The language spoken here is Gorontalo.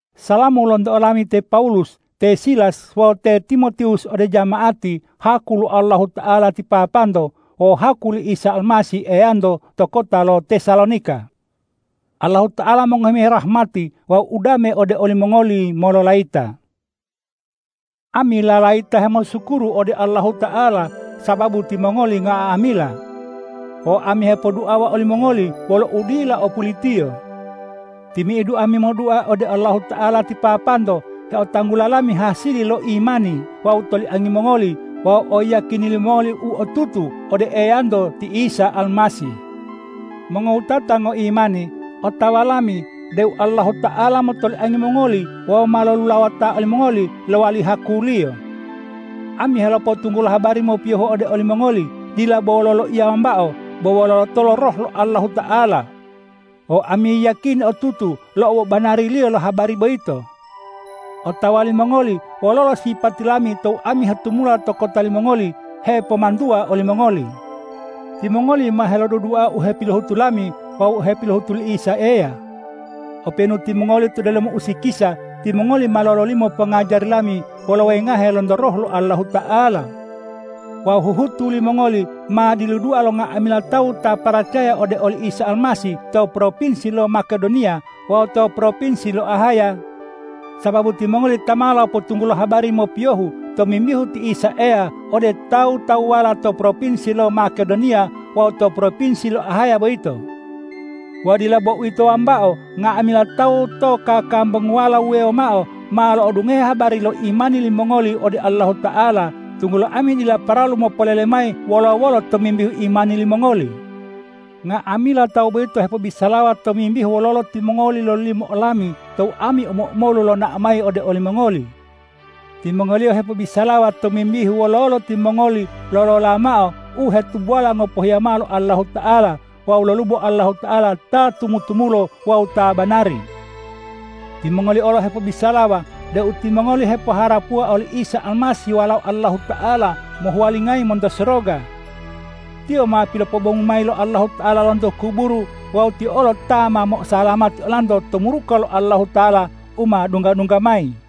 Salamu lonto olami te Pawulus, te Silas wawu te Timotiwus ode jama'ati haku lo Allahuta'ala ti Papanto wawu haku li Isa Almasih Eyanto to kota lo Tesalonika. Allahuta'ala mongohi mayi rahmati wawu udame ode olimongoli mololayita. Ami lalayita hemosukuru ode Allahuta'ala sababu timongoli nga'amila. Wawu ami hepoduawa olimongoli wolo udila o pulitiyo. Timi'idu ami modua ode Allahuta'ala ti Papanto heotanggula lami hasili lo imani wawu toliangi mongoli wawu oyiyakini limongoli u otutu ode Eyanto ti Isa Almasih. Mongowutata ngoimani, otawa lami deu Allahuta'ala motoliangi mongoli wawu ma lolulawota olimongoli lowali haku-Liyo. Ami helopotunggulo habari mopiyohu ode olimongoli, dila bo wolo loiya wambao, bo wolo lotolo Roh lo Allahuta'ala. Wawu ami yiyakini otutu lo obobanariliyo lo habari boyito. Otawa limongoli wololo sipati lami tou ami hetumula to kota limongoli hepomantuwa olimongoli. Timongoli ma helodudua u hepilohutu lami wawu u hepilohutu li Isa Eya. Openu timongoli to delomo usikisa, timongoli ma lololimo pongajari lami wolo wengahe lonto Roh lo Allahuta'ala. Wawu huhutu limongoli ma diludua lo nga'amila tawu ta paracaya ode oli Isa Almasih to propinsi lo Makedoniya wawu to propinsi lo Ahaya, sababu timongoli ta ma lopotunggulo habari mopiyohu tomimbihu ti Isa Eya ode tawu-tawuwala to propinsi lo Makedoniya wawu to propinsi lo Ahaya boyito. Wawu dila bo uwito wambao, nga'amila tawu to kakambunguwala wuwewo mao ma lo'odungohe habari lo imani limongoli ode Allahuta'ala, tunggulo ami dila paralu mopolele mayi wolo-wolo tomimbihu imani limongoli. Nga'amila tawu boyito hepobisalawa tomimbihu wololo timongoli lololimo olami tou ami omo-omolu lonao mayi ode olimongoli. Timongoliyo hepobisalawa tomimbihu wololo timongoli lolola mao u hetubola ngopohiya mao lo Allahuta'ala wawu lolubo Allahuta'ala ta tumu-tumulo wawu ta banari. Timongoliyo olo hepobisalawa deu timongoli hepoharapuwa oli Isa Almasih Walao Allahuta'ala mohuwalingayi monto soroga. Tiyo ma pilopobongu mayi lo Allahuta'ala lonto kuburu wawu Tiyo olo ta mo'osalamati olanto to muruka lo Allahuta'ala u ma dungga-dungga mayi.